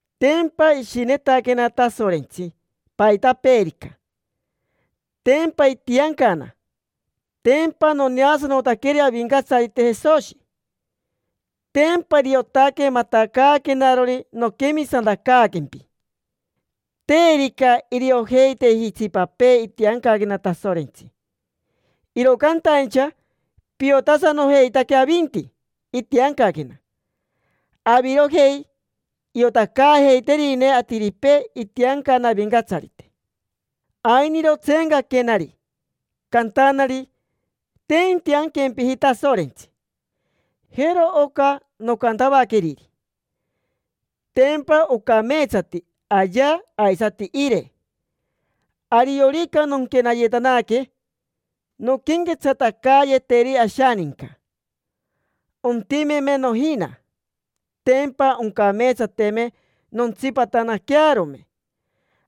Tempa ishinetaquena Tasorentsi paitapeerica. Tempa itiancana. Tempa noneasanotaqueri Avincatsarite Jesoshi. Tempa iriotaque matacaaquenarori noquemisantacaaquempi. Terica iriojeiteji itsipapee itiancaquena Tasorentsi, iro cantaincha piotasanojeitaque avinti itiancaquena. Avirojei iotacaajeiterine atiripee itiancana Avincatsarite. Ainiro tseencaquenari, cantanari: “Te intianquempiji Tasorentsi”. Jero oca nocantavaqueriri: “Tempa ocameetsati ayea aisati ire. Ariorica nonquenayetanaque nonquenquetsatacayeteri ashaninca; ontimeme nojina, tempa oncameetsateme nontsipatanaquearome.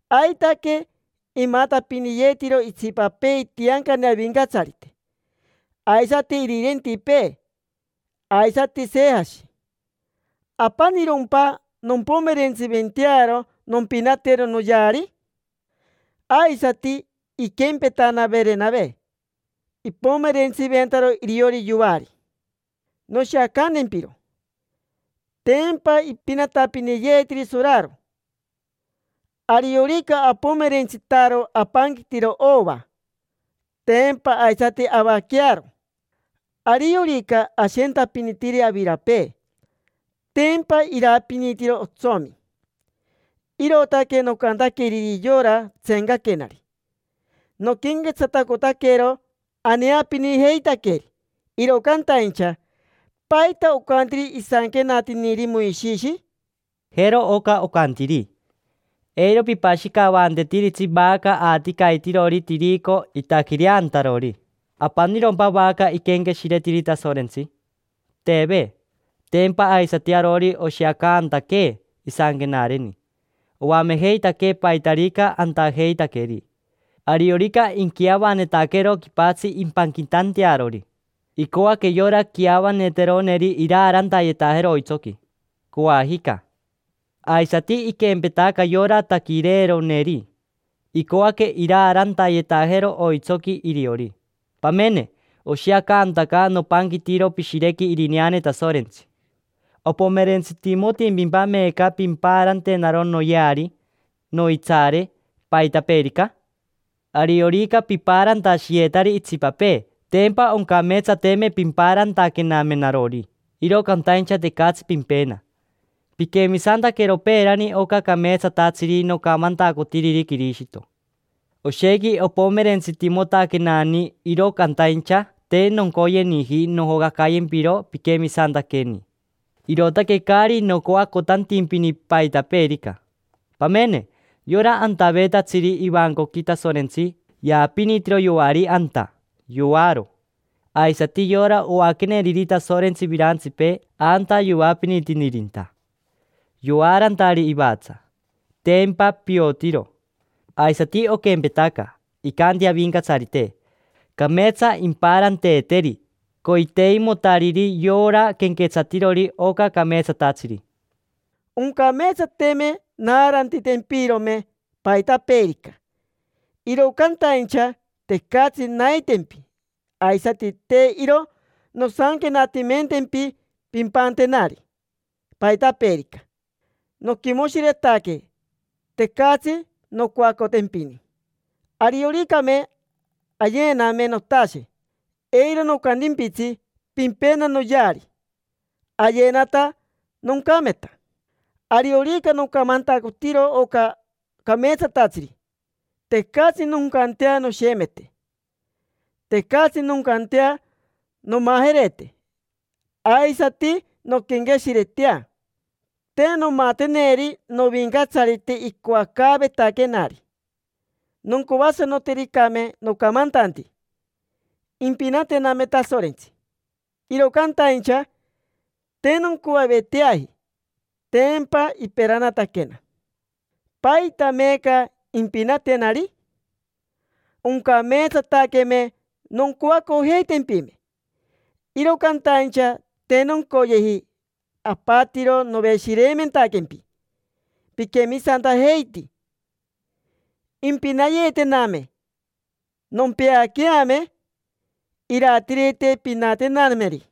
Aitaque imatapiniyetiro itsipapee itiancane Avincatsarite, aisati irirentipee, aisati Sejashi. ¿Apanirompa nompomerentsiventearo nompinatero noyeari? Aisati iquempetana Verenave, ipomerentsiventaro iriori yoari. Noshiacantempiro: tempa ipinatapiniyeetiri soraro. Ariorica apomerentsitaro apanquitiro ova, tempa aisati avaquearo. Ariorica ashentapinitiri avirapee, tempa irapinitiro otsomi”. Irootaque nocantaqueriri yora tseencaquenari. Noquenquetsatacotaquero aneapinijeitaqueri, iro cantaincha ¿paita ocantiri isanquenatiniri Moishishi? Jero oca ocantiri: “Eiro pipashicavantetiritsi vaca aticaitirori tirico itaquireantarori”. ¿Apanirompa vaca iquenqueshiretiri Tasorentsi? Teve. Tempa aisati arori oshiacantaquee isanquenareni. Oamejeitaquee paitarica antajeitaqueri. Ariorica inquiavanetaquero quipatsi impanquitantearori, icoaque yora quiavaneteroneri iraarantayetajero oitsoqui, coajica. Aisati iquempetaca yora taquireeroneri, icoaque iraarantayetajero oitsoqui iriori. Pamene, oshiacantaca nopanquitiro pishirequi irineane Tasorentsi. ¿Opomerentsitimotimpimpa meeca pimpaarantenaro noyeari, noitsaare, paitapeerica? Ariorica pipaarantashiyetari itsipapee, tempa oncameetsateme pimpaarantaquename narori. Iro cantaincha tecatsi pimpena. Piquemisantaquero peerani oca cameetsatatsiri nocamantacotiriri Quirishito. Oshequi opomerentsitimotaquenani, iro cantaincha te noncoyeniji nojocacayempiro piquemisantaqueni, irootaque caari nocoacotantimpini paitapeerica. Pamene. Yora antaveetatsiri ivancoqui Tasorentsi yaapinitiro yoari anta, yoaro. Aisati yora oaqueneriri Tasorentsi virantsipee anta yoapinitinirinta, yoaarantari ivatsa. Tempa piotiro. Aisati oquempetaca, icanti Avincatsarite: “Cameetsa impaaranteeteri coiteimotariri yora quenquetsatirori oca cameetsatatsiri”. Oncameetsateme naarantitempirome paitapeerica, iro cantaincha tecatsi naitempi. Aisati te iro nosanquenatimentempi pimpantenari paitapeerica. Noquimoshiretaque tecatsi noncoacotempini; arioricame ayename notashe, eiro nocantimpitsi: “Pimpena noyeari”. Ayenata, noncameta. Ariorica nocamantacotiro oca cameetsatatsiri, tecatsi noncantea noshemete. Tecatsi noncantea nomajerete, aisati nonquenqueshiretea: “Te nomateneri Novincatsarite icoacaavetaquenari”. Noncoasanotericame nocamantanti, impinatename Tasorentsi. Iro cantaincha te noncoaveteaji, tempa iperanataquena. ¿Paita meeca impinatenari? Oncameetsataqueme noncoacojeitempime, iro cantaincha te noncoyeji. Apatiro noveshireimentaquempi piquemisantajeiti. Impinayeetename, nompeaqueame iratirite pinatenanemeri,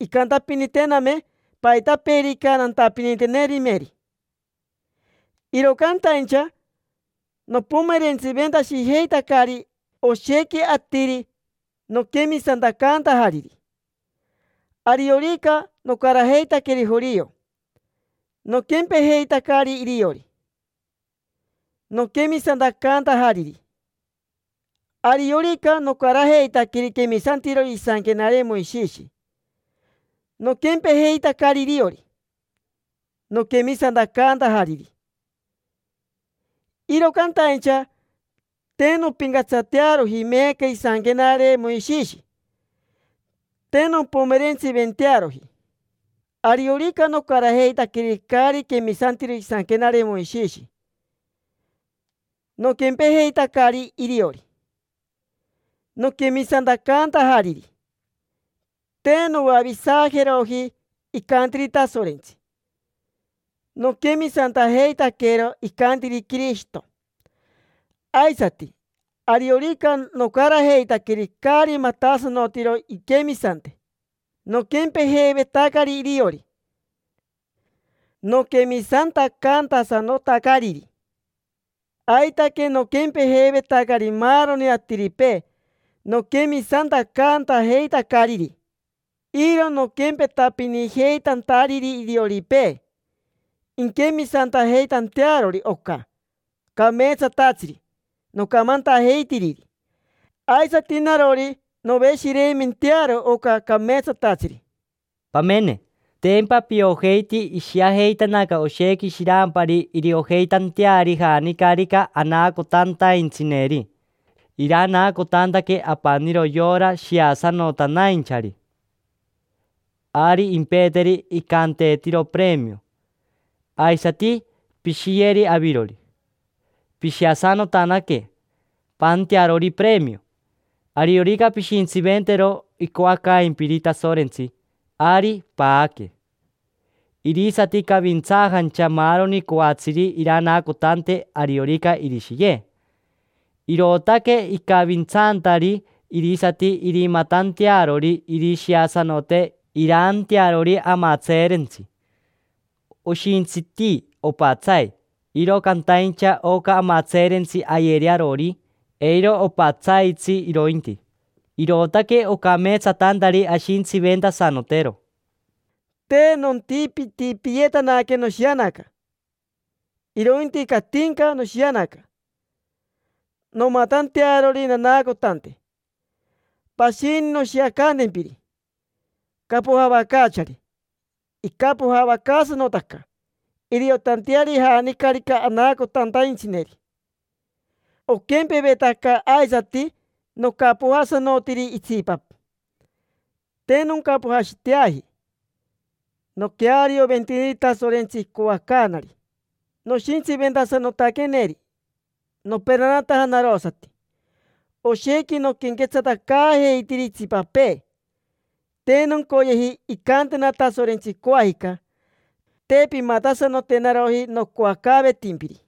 incantapinitename paitapeerica nantapinitenerimeri. Iro cantaincha nopomerentsiventashijeitacari oshequi atiri noquemisantacantajariri. Ariorica nocarajeitaqueri jorio, noquempejeitacari iriori, noquemisantacantajariri. Ariorica nocarajeitaqueri quemisantirori isanquenare Moishishi, noquempejeitacari iriori, noquemisantacantajariri. Iro cantaincha te nompincatsatearoji meeca isanquenare Moishishi, te nompomerentsiventearoji. Ariorica nocarajeitaqueri caari quemisantiro isanquenare Moishishi, noquempejeitacari iriori, noquemisantacantajariri. Te noavisajeroji icantiri Tasorentsi; noquemisantajeitaquero icantiri Quirishito. Aisati, ariorica nocarajeitaqueri caari matasanotiro inquemisante, noquempejeivetacari iriori, noquemisantacantasanotacariri. Aitaque noquempejeivetacari maaroni atiripee noquemisantacantajeitacariri. Iro noquempetapinijeitantariri irioripee inquemisantajeitantearori oca cameetsatatsiri nocamantajeitiriri. Aisati narori, noveshireimentearo oca cameetsatatsiri. Pamene, tempa piojeiti ishiajeitanaca oshequi shirampari iriojeitanteari janicarica anaacotantaintsineri. Iranaacotantaque apaniro yora shiasanotanainchari, ari impeeteri icanteetiro premio. Aisati pishiyeri avirori, pishiasanotanaque, paantearori premio. Ariorica pishintsiventero icoacaimpiri Tasorentsi, ari paaque. Irisati cavintsaajancha maaroni coatsiri iranaacotante ariorica irishiye. Irootaque icavintsantari irisati irimatantearori irishiasanote iraantearori amatseerentsi. Oshintsiti opatsai, iro cantaincha oca amatseerentsi ayeri arori, eiro opatsaitsi irointi, irootaque ocameetsatantari ashintsiventasanotero. Te nontipitipiyetanaque noshianaca, irointi catinca noshianaca nomatantearori nanaacotante. Pashini noshiacantempiri capojavacaachari. Icapojavacaasanotaca iriotanteari janicarica anaacotantaintsineri. Oquempevetaca aisati nocapojasanotiri itsipa, te noncapojaiteashiteaji; noquearioventiniri Tasorentsi icoacaanari, noshintsiventasanotaqueneri; noperanataja narosati. Oshequi noquenquetsatacaajeitiri itsipapee, te noncoyeji incantena Tasorentsi coajica: “Te pimatasanotenaroji nocoacaavetimpiri”.